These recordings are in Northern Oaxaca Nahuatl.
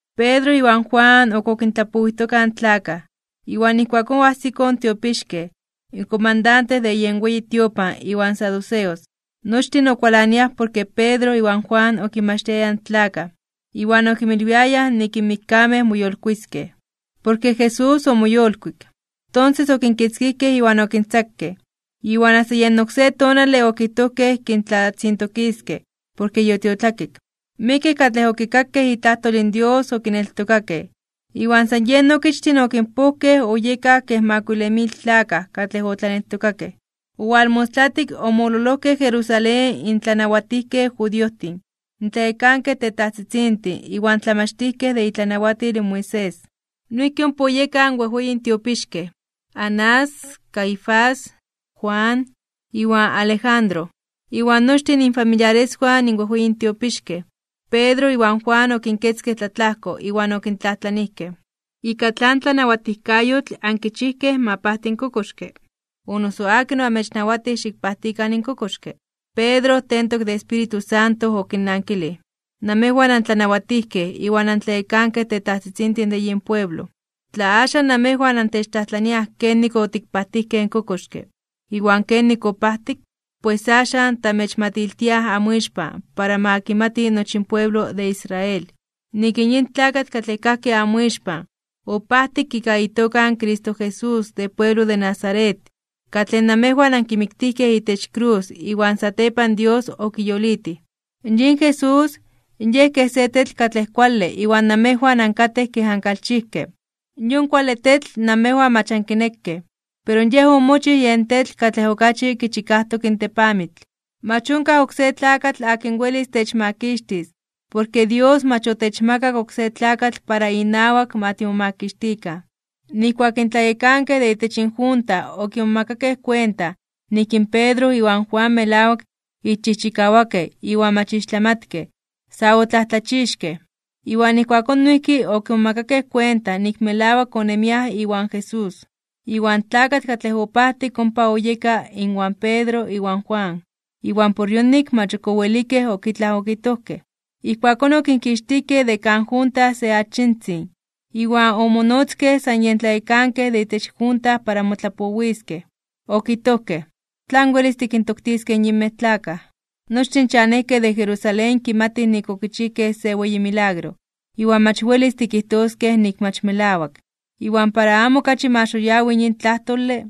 Pedro iwan Juan ok okintlapowijtokaj in tlakaj, iwan ijkuakón oajsikoj in tiopixkej, in komandante de yen weyi tiopan iwan saduceos. Nochtin okualaniaj porke Pedro iwan Juan okinmachtiayaj in tlakaj, iwan okinmilwiayaj nik in mikkamej moyolkuiskej (moyolitiskej) porke Jesús omoyolkuik. Tonses okinkitzkijkej iwan okintzakej, iwan asta yen oksé tonale okijtojkej kintlatzintokiskej porke yotiotlakik. Miekej katlej okikakej itlajtol in Dios okineltokakej, iwan san yen okichtin okinpojkej oyekaj kej makuile mil tlakaj katlej otlaneltokakej. Owalmostlatik omololojkej Jerusalén in tlanawatijkej judiojtin, in tlayekankej tetajtzitzintin iwan tlamachtijkej de itlanawatil in Moisés. Noijki ompa oyekaj in wejweyin tiopixkej, Anás, Caifás, Juan, iwan Alejandro. Iwan nochtin infamiliareswan in wejweyin tiopixkej. Pedro iwan Juan okinketzkej tlatlajko iwan okintlajtlanijkej: ―¿Ika tlan tlanawatijkayotl ankichijkej ma pajti in kokoxke, o noso akin oamechnawatij xikpajtikan in kokoxke? Pedro tentok de Espíritu Santo okinnankilij: ―Namejwan antlanawatijkej iwan antlayekankej tetajtzitzintin de yin pueblo. Tla axan namejwan antechtlajtlaniaj kenik otikpalewijkej in kokoxke, iwan kenik opajtik, pues axan, tamechmatiltiaj amoixpan para ma kimati nochi in pueblo de Israel, nik in yin tlakatl katlej kajki amoixpan, opajtik ika itoka in Cristo Jesús de pueblo de Nazaret, katlej namejwan ankimiktijkej itech krus iwan satepan Dios okiyolitij. Yin Jesús, Yej kej se tetl katlej kuale iwan namejwan ankatej kej ankalchijkej. Yon kuale tetl namejwan mach ankinekej, pero Yej omochij yen tetl katlej okachi kichikajtok in tepamitl. Mach onkaj oksé tlakatl akin welis techmakixtis, porke Dios mach otechmakak oksé tlakatl para inawak ma timomakixtikan. Nijkuak in tlayekankej de itech junta okimomakakej kuenta nik in Pedro iwan Juan melawak ixchijchikawakej iwan mach ixtlamatkej, sa otlajtlachixkej (omomajmawtijkej). Iwan ijkuakón noijki okimomakakej kuenta nik melawak onemiaj iwan Jesús. Iwan tlakatl katlej opajtik ompa oyeka inwan Pedro iwan Juan, iwan por yonik mach ok owelik ok itlaj okijtojkej. Ijkuakón okinkixtijkej de kan junta se achitzin, iwan omonotzkej san yen tlayekankej de itech junta para motlapowiskej. Okijtojkej: ―¿Tlan welis tikintoktiskej in yinmej tlakaj? Nochtin in chanejkej de Jerusalén kimatij nik okichijkej se weyi milagro, iwan mach welis tikijtoskej nik mach melawak. Iwan para amo okachi ma xoyawi (xitini) yin tlajtole,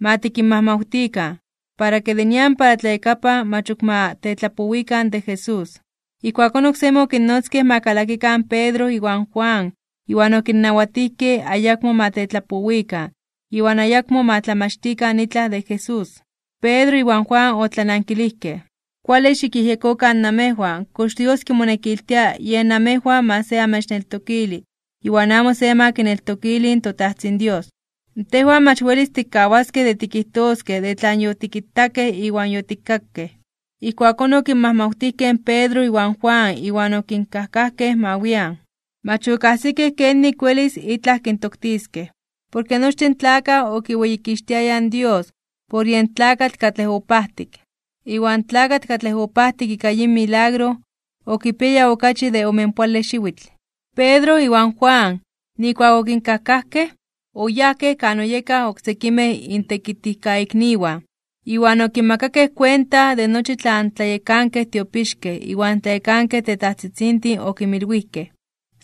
ma tikinmajmawtikan, para ke de nian para tlayakapan mach ok ma tetlapowikan de Jesús. Ijkuakón oksemi okinnotzkej ma kalakikan Pedro iwan Juan iwan okinnawatijkej ayakmo ma tetlapowikan iwan ayakmo ma tlamachtikan itlaj de Jesús. Pedro iwan Juan otlanankilijkej: ―Kuale xikyejyekokan namejwan kox Dios kimonekiltia yej amejwan se ma amechneltokili iwan amo se ma kineltokili in toTajtzin Dios. Tejwan mach welis tikkawaskej de tikijtoskej de tlan yotikitakej iwan yotikkakej. Ijkuakón okinmajmawtijkej in Pedro iwan Juan iwan okinkajkajkej ma wian. Mach okajsikej kenik welis itlaj kintoktiskej, porke nochtin in tlakaj okiweyikixtiayaj in Dios por yen tlakatl katlej opajtik. Iwan in tlakatl katlej opajtik ika yin milagro, okipiaya okachi de omenpoale xiwitl. Pedro iwan Juan, nijkuak okinkajkajkej, oyajkej kan oyekaj in oksekimej intekitijkaikniwan, iwan okinmakakej kuenta de nochi tlan tlayekankej tiopixkej iwan tlayekankej tetajtzitzintin okinmilwijkej.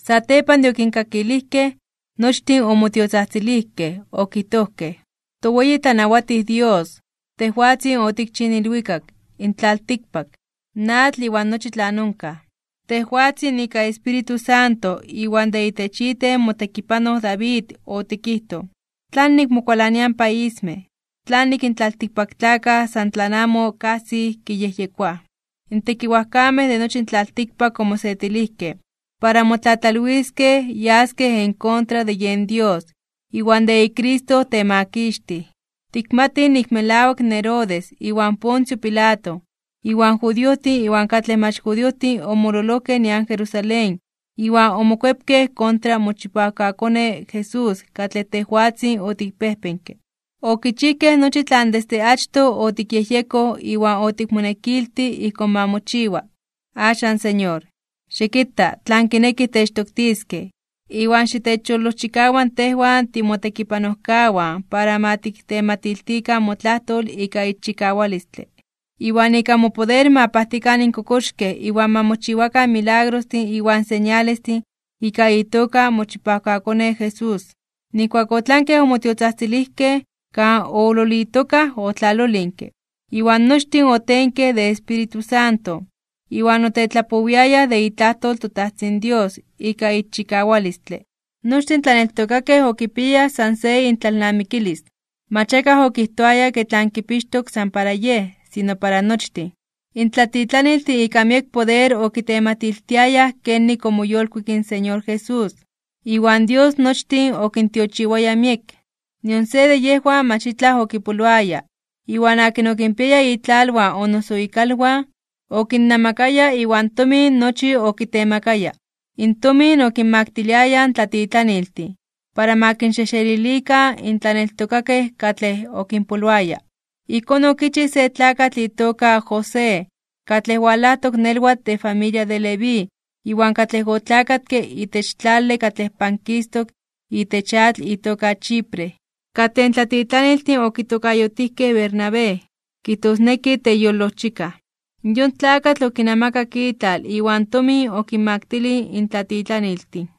Satepan de okinkakilijkej, nochtin omotiotzajtzilijkej okijtojkej: ―ToWeyi tlanawatij Dios, tejwatzin otikchij in ilwikak, in tlaltikpak, in atl iwan nochi tlan onkaj. Tejwatzin ika Espíritu Santo iwan de itech iten motekipanoj David otikijtoj: ¿Tlanik mokualaniaj in paismej? ¿Tlanik in tlaltikpaktlakaj san tlan amo kajsij kiyejyekoaj? In tekiwajkamej de nochi in tlaltikpak omosetilijkej, para motlatlalwiskej para yaskej en kontra de yen Dios iwan de iCristo temakixtij. ’Tikmatij nik melawak in Herodes, iwan Poncio Pilato, iwan judiojtin iwan katlej mach judiojtin omololojkej nian Jerusalén iwan omokuepkej kontra mochipawkaKone Jesús katlej tejwatzin otikpejpenke. Okichijkej nochi tlan desde achtoj otikyejyekoj iwan otikmonekiltij ijkón ma mochiwa. Axan Señor, xikita tlan kinekij techtoktiskej, iwan xitechyolojchikawa tejwan timotekipanojkawan para ma tiktematiltikan motlajtol ika ixchikawalistle. Iwan ika mopoder ma pajtikan in kokoxkej iwan ma mochiwakan milagrostin iwan señalestin ika itoka in mochipawkaKone Jesús. Nijkuak otlankej omotiotzajtzilijkej, kan oololitokaj otlalolinke, iwan nochtin otenkej de Espíritu Santo, iwan otetlapowiayaj de itlajtol in toTajtzin Dios ika ixchikawalistle. Nochtin in tlaneltokakej okipiayaj san se intlalnamikilis. Mach akaj okijtoaya ke tlan kipixtok san para yej, sino para nochtin. In tlatitlaniltin ika miek poder okitematiltiayaj kenik omoyolkuik in Señor Jesús, iwan Dios nochtin okintiochiwaya miek. Nion se de yejwan mach itlaj okipoloaya, iwan akin okinpiaya itlalwan o noso ikalwan, okinnamakaya iwan tomin nochi okitemakaya. In tomin okinmaktiliayaj in tlatitlaniltin, para ma kinxejxelilikan in tlaneltokakej katlej okinpoloaya. Ijkón okichij se tlakatl itoka José, katlej walajtok nelwatl de familia de Leví iwan katlej otlakatke itech tlale katlej pankistok itech atl itoka Chipre, katlej in tlatitlaniltin okitokayotijkej Bernabé, kijtosneki teyolojchikaj. Yon tlakatl okinamakak itlal iwan tomin okinmaktilij in tlatitlaniltin.